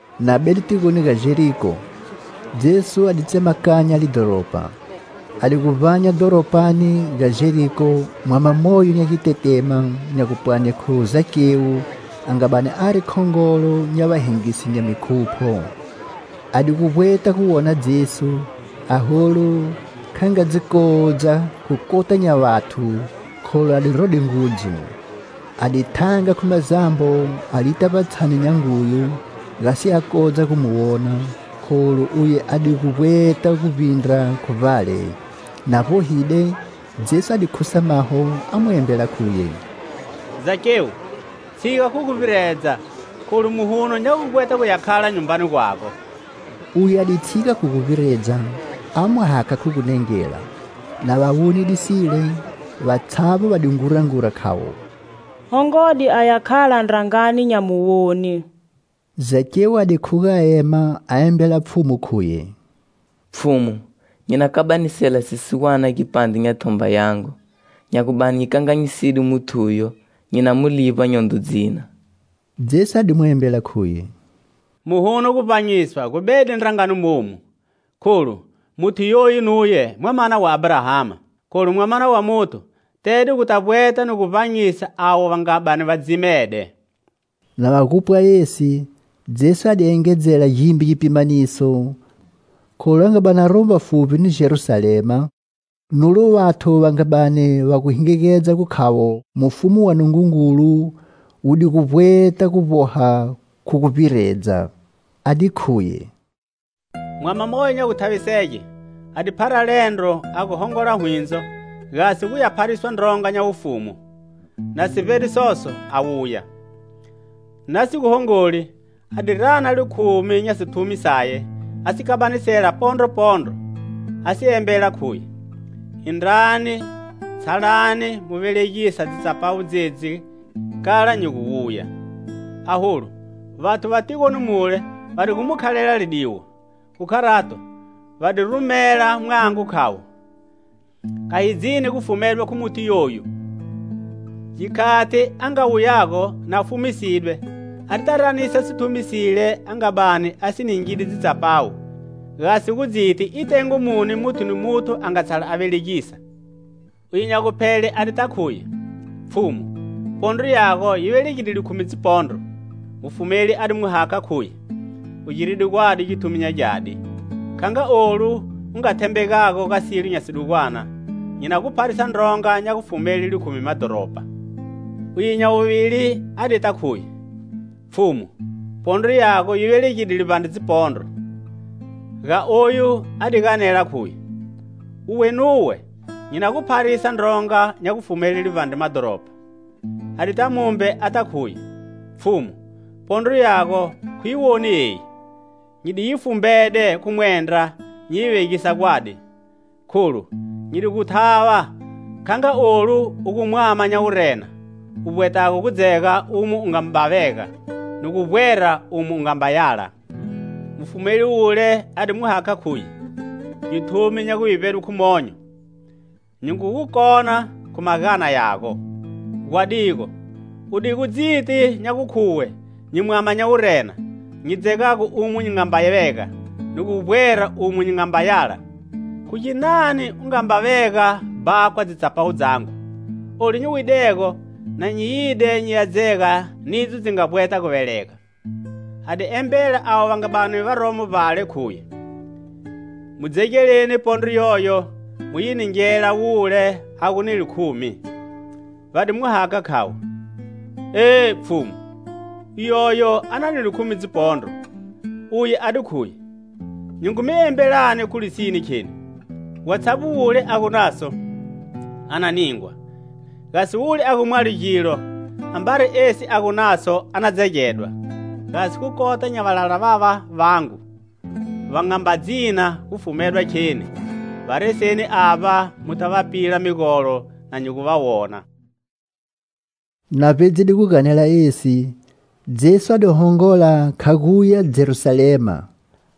Na bede tigoni ga Jeriko, Jesu a di tsemakanya lidhoropa. A di gu vbanya dhoropani ga Jeriko mwama moyo nya gitetema, nya gupwani khu Zakewu, a nga bani ari khongolo nya vahengisi nya mikhupho. A di gu vbweta gu wona Jesu, aholu kha nga dzi kodza khu kota nya vathu, kholu a di rode ngudzu. A di thanga khu mazambo a lita vbatshani nya nguyu, gasi a kodze gu mu wona, kholu uye a di gu vbweta gu vbindra khu vbale. Na vbohide, Jesu a di khusa maho, a mu embela, khuye: "Zakewu, tshiga khu guvbiredza, kholu muhuno nya gu vbweta guya khala nyumbani gwago." Uye a di tshiga khu guvbiredza, a mu hakha khu gunengela. Na va wonide sile, vatshavbo va di ngurangura, khavo: "Hongode aya khala ndrangani nya muwoni." Zakewu a di khuga a ema a embela Pfhumu, khuye: "Pfhumu, nyi na kabanisela sisiwane gipandre nya thomba yangu, nya gu bani nyi kanganyiside muthuyo, nyi na mu livba nyondro dzina." Jesu a di mu embela, khuye: "Muhuno guvbanyiswa gu bede ndrangani momu, kholu muthu yoyu nuye mwamana wa Abrahama. Kholu Mwamana wa Muthu tede guta vbweta ni gu vbanyisa avo va nga bani va dzimede." Na va gu pwa esi, Jesu a di engedzela gimbe gipimaniso, kholu a nga bani aromo vbafuvbi ni Jerusalema, nulo vathu va nga bani va gu hingigedza gukhavo mufumu wa Nungungulu wudigu vbweta gu vboha khu guvbiredza. A di khuye: "Mwama moyo nya guthavisege a di phara liendro a gu hongola hwindzo, gasi guya phariswa ndronga nya wufumu, na si vbede soso a wuya. Na si gu hongoli a di rana likhumi nya sithumi saye, a si kabanisela pondro pondro, a si embela, khuye: 'Indrani, tshalani mu velegisa dzitsapawu dzedzi kala nyi gu wuya.' Aholu vathu va tigoni mule va di gu mu khalela lidiwo, khu kharato, va di rumela mwango, khavo: 'Kha hi dzini gu fumedwa khu muthu yoyu.' "Gikhati a nga wuyago, na fumisidwe, adita ranisa sithumi sile a nga bani a si ningide dzitsapawu, gasi gu dziti i tengo muni muthu ni muthu a nga tshala a velegisa. "Uye nya guphele a dita khuye: 'Pfhumu, pondro yago yi velegide likhumi dzipondro!' Mufumeli a di mu hakha, khuye: 'U giride gwadi githumi nya gyadi; kha nga olu u nga thembegago ga silo nya sidugwana, nyi na gu pharisa ndronga nya gufumele likhumi madhoropa.' "Uye nya wuvili a dita khuye: 'Pfhumu, pondro yago yi velegide livbandre dzipondro.' Ga oyu a di ganela, khuye: 'Uwe nuwe nyi na gu pharisa ndronga nya gufumele livbandre madhoropa.' "A dita mumbe ata khuye: 'Pfhumu, pondro yago khu yi woni eyi, nyi di yi fumbede khu mwendra nyi yi vegisa gwadi. Kholu nyi di gu gu thava, kha nga olu u gu mwama nya wurena, u vbwetago gu dzega umo u nga vega ni gu vbwera umo u nga yala!' Mufumeli wule a di mu hakha, khuye: 'Githumi nya gu vivbedwe khu monyo, nyi ngu gu kona khu magana yago. Gwadigo udigu dziti nya gukhuwe nyi mwama nya wurena, nyi dzegago umo nyi nga mba vega ni gu vbwera umo nyi nga mba yala, khu ginani u nga mba vega bhakwa dzitsapawu dzangu? Olu nyi widego na nyi yide nyi ya dzega nidzo dzi nga vbweta gu velegela.' A di embela avo va nga bani varomo vbale, khuye: 'Mu dzegeleni pondro yoyo mu yi ningela wule a gu ni likhumi.' Va di mu hakha, khavo: 'Eh! Pfhumu, uyoyo a na ni likhumi dzipondro!' Uye a di khuye: 'Nyi ngu mi embelani, khu lisine, kheni: watshavbo wule a gu naso, a na ningwa, gasi wule a gu mwalo gilo, ambari esi a gu naso a na dzegedwa. Gasi khu kota nya valala vava vangu, va nga mba dzina gu fumedwa kheni, va reseni avba muta va pila migolo na nyi gu va wona.' " Na vbedzide gu ganela esi, Jesu a di hongola kha guya Jerusalema.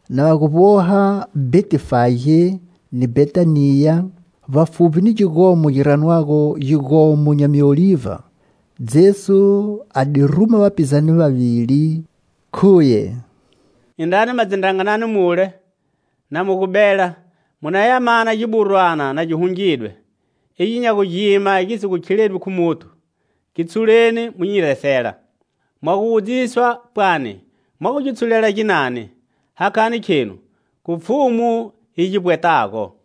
Na va gu vboha Bhetifage ni Bhetaniya, vbafuvbi ni gigomo gi ranwago Gigomo nya Miolivha, Jesu a di ruma vapizane vavili, khuye: 'Indrani ma dzindranganani mule, na mu gu bela, mu naya mana giburwana na gi hungidwe, igyo nya gu gima gi si gu khiledwi khu muthu. Gi tshuleni mu nyi resela. Mwa gu wudziswa pwani mwa gu gi tshulela ginani, hakhani khenu khu Pfhumu yi gi vbwetago."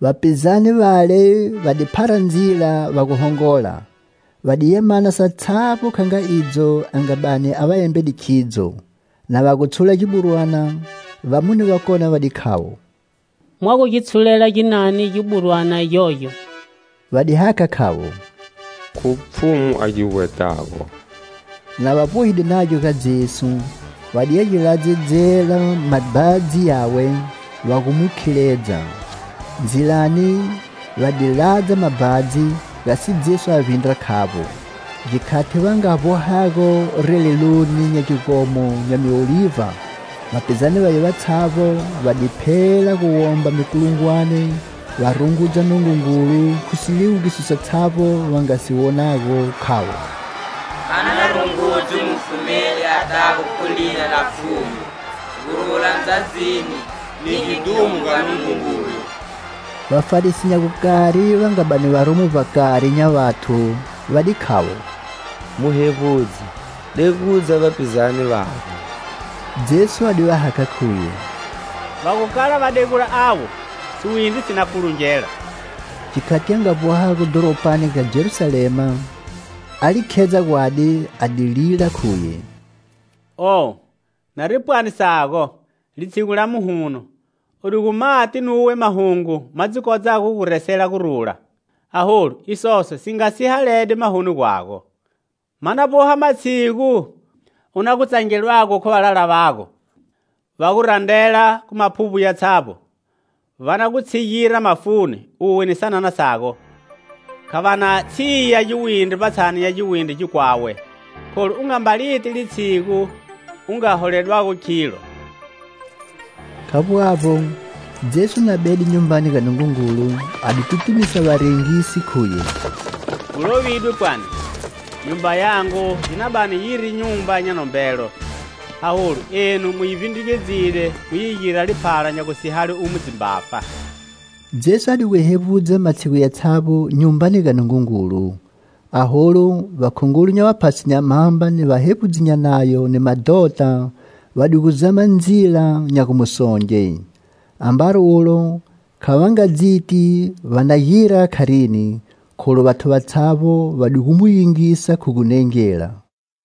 Vapizane vale va di phara ndzila, va gu hongola. Va diya mana satshavbo kha nga idzo a nga bani a va embede khidzo. Na va gu tshula giburwana, vamune vakone va di khavo: "Mwa gu gi tshulela ginani giburwana gyogyo?" Va di hakha, khavo: "Khu Pfhumu a gi vbwetago." Na va vbohide nagyo ga Jesu, va diya gi ladzedzela mabhadzi yawe, va gu mu khiledza. Ndzilani va di ladza mabhadzi, gasi Jesu a vbindra khavbo. Gikhati va nga vbohago releloni nya gigomo nya Miolivha, vapizane vaye vatshavbo va di phela gu womba mikulungwane, va rungudza Nungungulu khu siliwugiso satshavbo va nga si wonago, khavo: "A na rungudzwe Mufumeli atago khu lina la Pfhumu! Gurula ndzadzini,ni gidhumo ga Nungungulu!" Vafarisi nya gukari va nga bani varomo vbakari nya vathu, va di khavo: "Muhevbudzi, degudza vapizane vago." Jesu a di va hakha, khuye: "Va gu kala va degula avo, siwindri si na kulungela." Gikhati a nga vbohago dhoropani ga Jerusalema, a li khedza gwadi, a di lila, khuye: "Oh! Nari pwani sago, litshigu la muhuno u di gu mati nuwe mahungu ma dzi kodzago gu gu resela gurula! Aholu isoso si nga sihalegide mahoni gwago. Ma na vboha matshigu u na gu tsangedwago khu valala vago, va gu randrela khu maphuvbo yatshavbo. Va na gu tshigira mafuni, uwe ni sanana sago, kha va na tshiya giwindri vbatshani nya giwindri gikwawe, kholu u nga mba li ti litshigu u nga holedwago khilo!" Khavbo avbo, Jesu na bede Nyumbani ga Nungungulu, a di tutumisa varengisi, khuye: "Gu lovidwe, pwani: 'Nyumba yangu yi na bani yiri nyumba nya nombelo.' Aholu enu mu yi vbindrugedzile mu yi gira liphala nya gusihale umo dzimbafa." Jesu adigu hevbudza matshigu yatshavbo Nyumbani ga Nungungulu. Aholu vakhongolo nya vaphasi nya mhamba ni vahevbudzi nya Nayo ni madhota, va di gu zama ndzila nya gu mu songe. Ambari ulo kha va nga dziti va na gira kharini, kholu vathu vatshavbo va di gu mu yingisa khu gunengela.